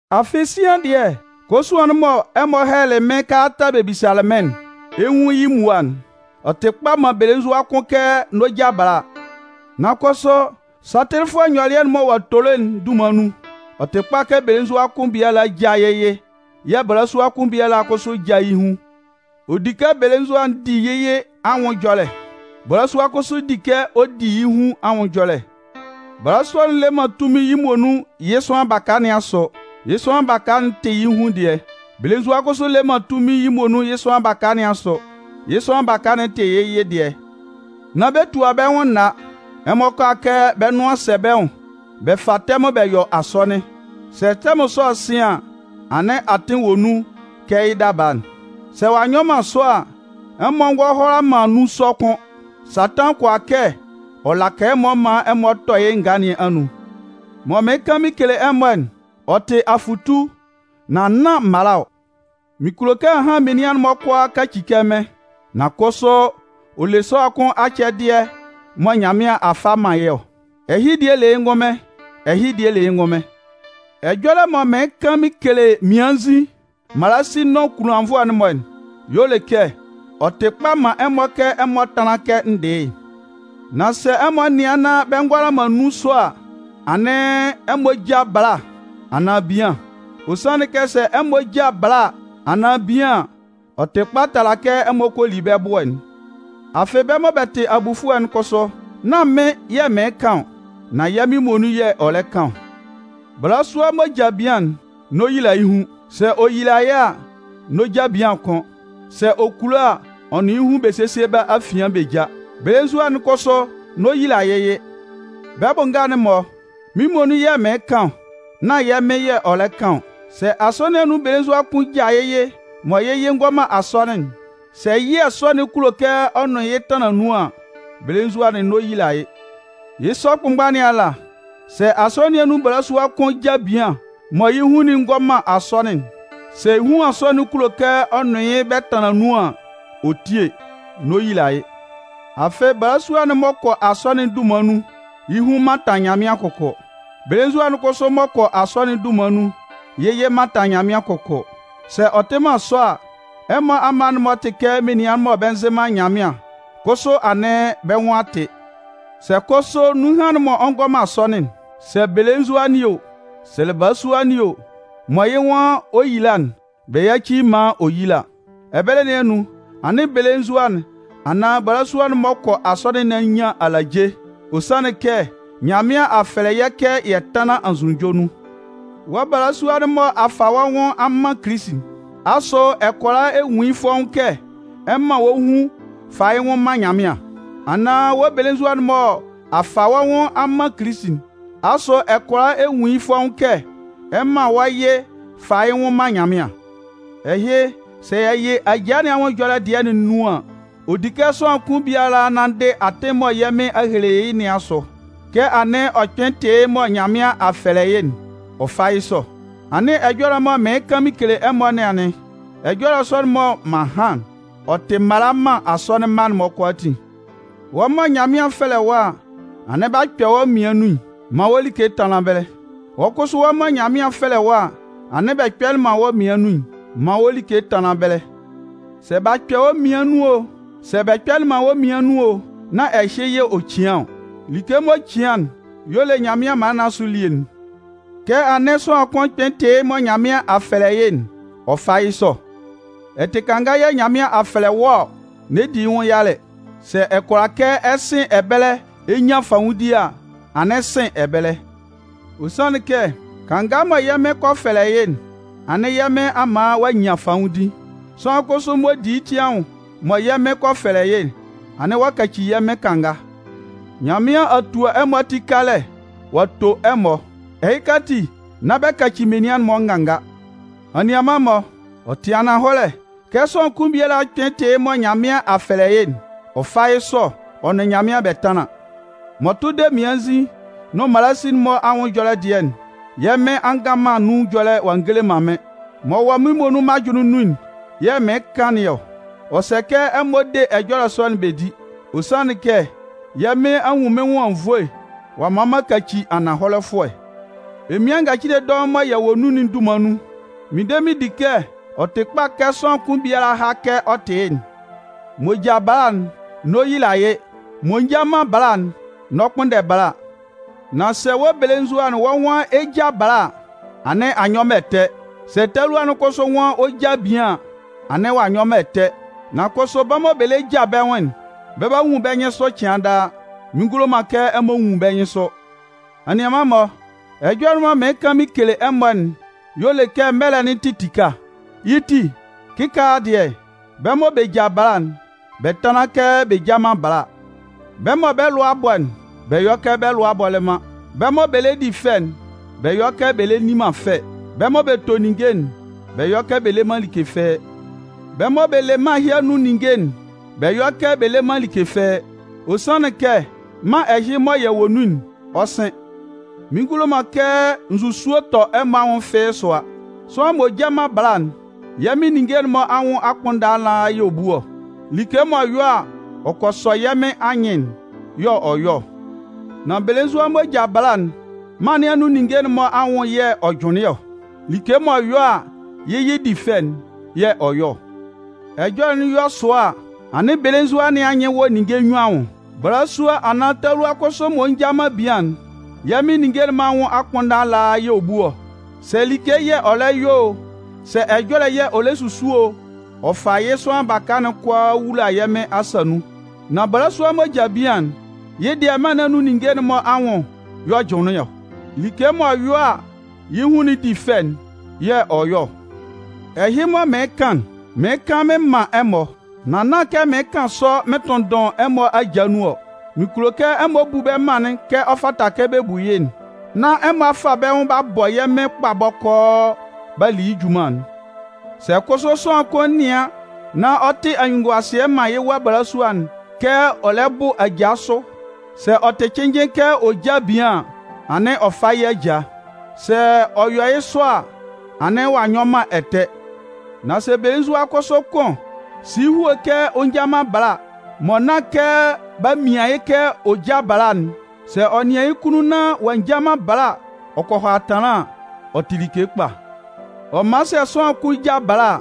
Afɩ sian dɩɛ, kosuan'n mɔ ɛmɔ hɛlɛlɩ mɩ́n kalata bɛ bisalɩ mɩ́n'n, ɛ 'nwun yɩ́ mmua'n. Ɔ tɩ kpa man belenzua kʋn kɛ n'ɔ ja bala. Nan kʋsʋ satɩlɩfʋɛ ɛyɔlɛ'n mɔ ɔ'a tolo'n dunman nun, ɔ tɩ kpa kɛ belenzua kʋn biala já yɩ́ yɩ yɛ̂ balasua kʋn biala kʋsʋ já yɩ́ hun. Ɔ di kɛ belenzua'n di yɩ́ yɩ anwʋn ɛjɔlɛ, balasua'n kʋsʋ di kɛ ɔ di yɩ́ hun anwʋn ɛjɔlɛ. Balasua'n le man tunmin yɩ́ muonun yɩ́ sʋanlan baka nɩn asʋ. Yɩ́ sʋanlan baka'n tɩ yɩ́ hun dɩɛ. Belenzua'n kʋsʋ le man tunmin yɩ́ muonun yɩ́ sʋanlan baka nɩn asʋ. Yɩ́ sʋanlan baka'n tɩ yɩ́ yɩ dɩɛ. Nán bɛ tua bɛ́ nwʋn nna. Ɛmɔ kʋala kɛ bɛ́ nʋan sɛ bɛ́ nwʋn bɛ fa tɛmʋn bɛ yɔ asɔnɩn. Sɛ tɛmʋn sɔ'n sɩn an, anɩn atɩn wɔ nun kɛ yɩ́ daba'n. Sɛ ɔ'a nyɔ man sɔ a, ɛmɔ ngɔ hʋala man nun sɔ kʋ́n. Satan kʋala kɛ ɔ laka ɛmɔ maan ɛmɔ tɔ yɩ́ ngaa nɩn anun. Mɔ mɩɩn kan mɩn kele ɛmɔ'n, ɔ tɩ afʋtu nan nán mala ɔ. Mɩn kulo kɛ ahan menian'n-mɔ kʋalaa kaci kɛ mɩ́n. Nan kʋsʋ ɔ le sʋanlan kʋn acɛdɩɛ dɩɛ mɔ Nyanmɩan a fa a man yɩ́ ɔ, ɛhɩ dɩɛ le yɩ́ ngʋnmɩn, ɛhɩ dɩɛ le yɩ́ ngʋnmɩn. Ɛjɔlɛ mɔ mɩɩn kan mɩn kele mmiannzin, mmalasin nʋn kunlannvʋɛ'n-mɔ'n y'ɔ le kɛ ɔ tɩ kpa man ɛmɔ kɛ ɛmɔ tánlan kɛ n dɩ yɩ́'n. Nan sɛ ɛmɔ nɩan nán bɛ ngʋala man nun sɔ a, anɩn ɛmɔ já bala anaan bian. Ɔ sanlɩn kɛ sɛ ɛmɔ ja bala anaan bian an, ɔ tɩ kpa tala kɛ ɛmɔ kɔ li bɛ́ ɛbʋɛ'n. Afɩ bɛ́ mɔ bɛ tɩ abufʋɛ'n kʋsʋ, nán mɩ́n yɛ̂ mɩɩn kan ɔ, nan yɛ́ Mɩn muonun yɛ̂ ɔ lɛ kan ɔ. Balasua m'ɔ ja bian'n, n'ɔ yila yɩ́ hun. Sɛ ɔ yila a, n'ɔ ja bian kʋ́n. Sɛ ɔ kulo a, ɔ nʋn yɩ́ hun bɛ sésie bɛ́ afian bɛ já. Belenzua'n kʋsʋ n'ɔ yila yɩ́ yɩ. Bɛ́ bʋ nga'n-mɔ (Mɩ́n muonun yɛ̂ mɩɩn kan ɔ, nán yɛ́ Mɩn yɛ̂ ɔ lɛ kan ɔ.) Sɛ Asɔnɩn nɩn anun belenzua kʋn ja yɩ́ yɩ mɔ yɩ́ yɩ'n ngɔ man asɔnɩn'n, sɛ yɩɛ sɔ'n kulo kɛ ɔ nʋn yɩ́ tanlan nun an, belenzua'n n'ɔ yila yɩ́. Yɩ́ sɔ kʋnmgba nɩn ala, sɛ Asɔnɩn nɩn anun balasua kʋn ja bian mɔ yɩ́ hun'n ngɔ man asɔnɩn'n, sɛ huan sɔ'n kulo kɛ ɔ nʋn yɩ́ yɩ bɛ tanlan nun an, ɔ tíe, n'ɔ yila yɩ́. Afɩ balasua'n m'ɔ kɔ asɔnɩn'n dunman nun, yɩ́ hun mantan Nyanmɩan kʋkʋ. Belenzua'n kʋsʋ m'ɔ kɔ asɔnɩn'n dunman nun, yɩ́ yɩ mantan Nyanmɩan kʋkʋ. Sɛ ɔ tɩ man sɔ a, ɛmɔ amma'n-mɔ tɩ kɛ menian mɔ bɛ nzɩ man Nyanmɩan kʋsʋ anɩn bɛ́ nwʋn a tɩ. Sɛ kʋsʋ nunhan'n m'ɔ ngɔ man asɔnɩn'n, sɛ belenzua nɩn o, sɛ balasua nɩn o, mɔ yɩ́ nwan ɔ 'yila'n, bɛ yáci yɩ́ maan ɔ yíla. Ɛbɛlɛ nɩn anun, anɩn belenzua'n anaan balasua'n m'ɔ kɔ asɔnɩn nɩn a nyan alaje. Ɔ sanlɩn kɛ Nyanmɩan a fɛlɛ yɛ́ kɛ yɛ tánlan anzʋnunjɔ nun. Wɔ́ balasua'n mɔ a fa wɔ́ nwʋn a man Kilisi'n, asʋ ɛ kʋala ɛ nwun yɩ́ fɔ́ʋ́n kɛ ɛ 'man wɔ́ hun fa yɩ́ nwʋn man Nyanmɩan? Anaan wɔ́ belenzua'n mɔ a fa wɔ́ nwʋn a man Kilisi'n, asʋ ɛ kʋala ɛ nwun yɩ́ fɔ́ʋ́n kɛ ɛ 'man wɔ́ yɩ fa yɩ́ nwʋn man Nyanmɩan? Ɛhɩ, sɛ yɛ yɩ ajaa nɩn anwʋn ɛjɔlɛ dɩɛ'n nun an, ɔ di kɛ sʋanlan kʋn biala nanndɩ atɩn'n mɔ Nyanmɩan a hele yɩ́ nɩn asʋ. Kɛ anɩn ɔ kpɩn tɩ yɩ́ mɔ Nyanmɩan a fɛlɛ yɩ́'n, ɔ fá yɩ́ sɔ. Anɩn ɛjɔlɛ mɔ mɩɩn kan mɩn kele ɛmɔ nɩn anɩn. Ɛjɔlɛ sɔ'n mɔ m'an han'n, ɔ tɩ mala man Asɔnɩn'n-mɔ kʋalaatin. Wɔ́ mɔ Nyanmɩan 'fɛlɛ wɔ́ a, anɩn b'a kpɛ wɔ́ mmian nun'n, man wɔ́ like tánlan ɛbɛlɛ. Wɔ́ kʋsʋ mɔ Nyanmɩan 'fɛlɛ wɔ́ a, anɩn bɛ kpɛlɩ man wɔ́ mmian nun'n, man wɔ́ like tánlan ɛbɛlɛ. Sɛ b'a kpɛ wɔ́ mmian nun o, sɛ bɛ kpɛlɩ man wɔ́ mmian nun o, nán ɛhɩ yɛ̂ ɔ cian ɔ. Like m'ɔ cian'n y'ɔ le Nyanmɩan mala nɩn asʋ elie'n. Kɛ anɩn sʋanlan kʋn kpɩn tɩ yɩ́ mɔ Nyanmɩan a fɛlɛ yɩ́'n, ɔ fá yɩ́ sɔ. Ɛ tɩ kanga yɛ̂ Nyanmɩan a fɛlɛ wɔ́ ɔ? N'ɛ di yɩ́ nwʋn yalɛ. Sɛ ɛ kʋala kɛ ɛ sɩn ɛbɛlɛ ɛ nyan fanwʋndi a, anɩn sɩn ɛbɛlɛ. Ɔ sanlɩn kɛ kanga mɔ yɛ́ Mɩn kɔ fɛlɛ yɩ́'n, anɩn yɛ́ Mɩn a man ɔ'a nyan fanwʋndi. Sʋanlan kʋsʋ m'ɔ di yɩ́ ti anwʋn mɔ yɛ́ Mɩn kɔ fɛlɛ yɩ́'n, anɩn ɔ'a kaci yɛ́ Mɩn kanga. Nyanmɩan a tua ɛmɔ ati kalɛ ɔ'a to ɛmɔ. Ɛhɩka ati, nán bɛ kaci menian'n-mɔ nganga. Anianman-mɔ, ɔ tɩ ananhɔlɛ, kɛ sʋanlan kʋn biala kpɩn tɩ yɩ́ mɔ Nyanmɩan a fɛlɛ yɩ́'n, ɔ fá yɩ́ sɔ ɔ nʋn Nyanmɩan bɛ tánlɩn. M'ɔ tʋ de mmiannzin nʋn mmalasin'n-mɔ anwʋn ɛjɔlɛ dɩɛ'n, yɛ́ Mɩn a ngan man nun ɛjɔlɛ ɔ'a ngele man mɩ́n. M'ɔ wɔ mɩ́n muonun mɩ́n ajʋnlɩn nun'n yɛ̂ mɩɩn kan nɩn ɔ. Ɔ sɛ kɛ ɛmɔ de ɛjɔlɛ sɔ'n bɛ di. Ɔ sanlɩn kɛ, yɛ́ Mɩn a nwun mɩ́n nwʋn anwunnvoe ɔ'a man m'an kaci ananhɔlɛfʋɛ. Emian ngacile dɔʋn mɔ yɛ wɔ nun'n dunman nun, mɩn de mɩn di kɛ ɔ tɩ kpa kɛ sʋanlan kʋn biala há kɛ ɔ tɩ yɩ́'n. M'ɔ ja bala'n, n'ɔ yila yɩ́. M'ɔ nja man bala'n, n'ɔ kpʋnndɛ bala. Nan sɛ wɔ́ belenzua'n wɔ́ nwan ɛ 'ja bala a, anɩn a nyɔ man ɛtɛ. Sɛ talua'n kʋsʋ nwan ɔ 'ja bian an, anɩn ɔ'a nyɔ man ɛtɛ. Nan kʋsʋ bɛ́ mɔ bɛ lɛ ja bɛ́ nwʋn'n, bɛ 'ba nwun bɛ́ nyɩnsʋ cɩan daa. Mɩn ngulo man kɛ ɛmɔ nwun bɛ́ nyɩnsʋ. Anianman-mɔ, ɛjɔlɛ'n mɔ mɩɩn kan mɩn kele ɛmɔ'n y'ɔ le kɛ mɛlɛ'n tɩ tika. Yɩ́ ti kɩkaala dɩɛ, bɛ́ mɔ bɛ ja bala'n, bɛ tánlan kɛ bɛ nja man bala. Bɛ́ mɔ bɛ́ lʋa a bɔ'n, bɛ yɔ́ kɛ bɛ́ lʋa bɔlɩ man. Bɛ́ mɔ bɛ lɛ di fɛ'n, bɛ yɔ́ kɛ bɛ lɛ nni man fɛ. Bɛ́ mɔ bɛ to ninnge'n, bɛ yɔ́ kɛ bɛ le man like fɩ́ɩ́. Bɛ́ mɔ bɛ le mân ɛhɩ anun ninnge'n, bɛ yɔ́ kɛ bɛ le man like fɩ́ɩ́. Ɔ sanlɩn kɛ mân ɛhɩ mɔ yɛ wɔ nun'n, ɔ 'sɩn. Mɩn ngulo man kɛ nzusue tɔ ɛmɔ anwʋn fɩ́ɩ́ sʋa. Sʋanlan m'ɔ nja man bala'n, yɛ́ Mɩn ninnge'n-mɔ anwʋn akpʋnndan ala yɛ̂ ɔ bu ɔ. Like m'ɔ yɔ a, ɔ kɔ sɔ yɛ́ Mɩn anyɩn'n, yɛ̂ ɔ yɔ ɔ. Nan belenzua m'ɔ ja bala'n, mân nɩn anun ninnge'n-mɔ anwʋn yɛ̂ ɔ jʋnlɩn ɔ. Like m'ɔ yɔ a yɩ́ yɩ di fɛ'n yɛ̂ ɔ yɔ ɔ. Ɛjɔlɛ'n yɔ sua a, anɩn belenzua nɩn anyɩn wɔ ninnge nnyuan anwʋn. Balasua anaan talua kʋsʋ m'ɔ nja man bian'n, yɛ́ Mɩn ninnge'n-mɔ anwʋn akpʋnndan ala yɛ̂ ɔ bu ɔ. Sɛ like yɛ̂ ɔ lɛ yɔ o, sɛ ɛjɔlɛ yɛ̂ ɔ lɛ susu o, ɔ fa yɩ́ sʋanlan baka'n kʋalaa wula yɛ́ Mɩn asa nun. Nan balasua m'ɔ ja bian'n, yɩ́ dɩɛ mân nɩn anun ninnge'n-mɔ anwʋn y'ɔ jʋnlɩn ɔ. Like m'ɔ yɔ a yɩ́ hun di fɛ'n yɛ̂ ɔ yɔ ɔ. Ɛhɩ mɔ mɩɩn kan'n, mɩɩn kan mɩn man ɛmɔ. Nan nán kɛ mɩɩn kan sɔ mɩn tʋnndʋn ɛmɔ aja nun ɔ. Mɩn kulo kɛ ɛmɔ bu bɛ mân'n kɛ ɔ fata kɛ bɛ bu yɩ́'n, nán ɛmɔ a fa bɛ́ nwʋn b'a bɔ yɛ́ Mɩn kpa bɔkɔɔ b'a li yɩ́ junman'n. Sɛ kʋsʋ sʋanlan kʋn nɩan nán ɔ tɩ anyunnunguasɩɛ man yɩ́ wa balasua'n kɛ ɔ lɛ bʋ aja sʋ, sɛ ɔ tɩ cɩnnjɩn kɛ ɔ já bian an, anɩn ɔ fá yɩ́ aja. Sɛ ɔ yɔ yɩ́ sɔ a, anɩn ɔ'a nyɔ man ɛtɛ. Nan sɛ belenzua kʋsʋ kʋn si yɩ́ hue kɛ ɔ nja man bala, mɔ nán kɛ b'a mian yɩ́ kɛ ɔ já bala'n, sɛ ɔ nɩan yɩ́ kunnun nán ɔ'a nja man bala ɔ kɔ hʋala tanlan an, ɔ tɩ like kpa. Ɔ man sɛ sʋanlan kʋn ja bala a,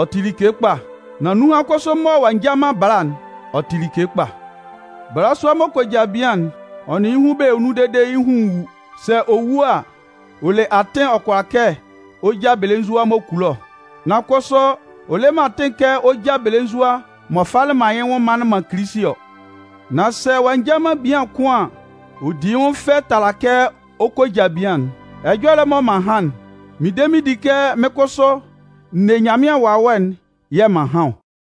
ɔ tɩ like kpa. Nan nunhan kʋsʋ mɔ ɔ'a nja man bala'n, ɔ tɩ like kpa. Balasua m'ɔ kɔ ja bian'n, ɔ nʋn yɩ́ hun bɛ wɔ nun dede yɩ́ hun wu. Sɛ ɔ wu a, ɔ le atɩn ɔ kʋala kɛ ɔ ja belenzua m'ɔ kulo ɔ. Nan kʋsʋ, ɔ le man atɩn kɛ ɔ ja belenzua m'ɔ falɩ man yɩ́ nwʋn manlɩn man Kilisi ɔ. Nan sɛ ɔ'a nja man bian kʋ́n an, ɔ 'di yɩ́ nwʋn fɛ tala kɛ ɔ kɔ ja bian'n. Ɛjɔlɛ'n mɔ m'an han'n, mɩn de mɩn di kɛ mɩ́n kʋsʋ n ne Nyanmɩan Wawɛ'n yɛ̂ m'an han ɔ.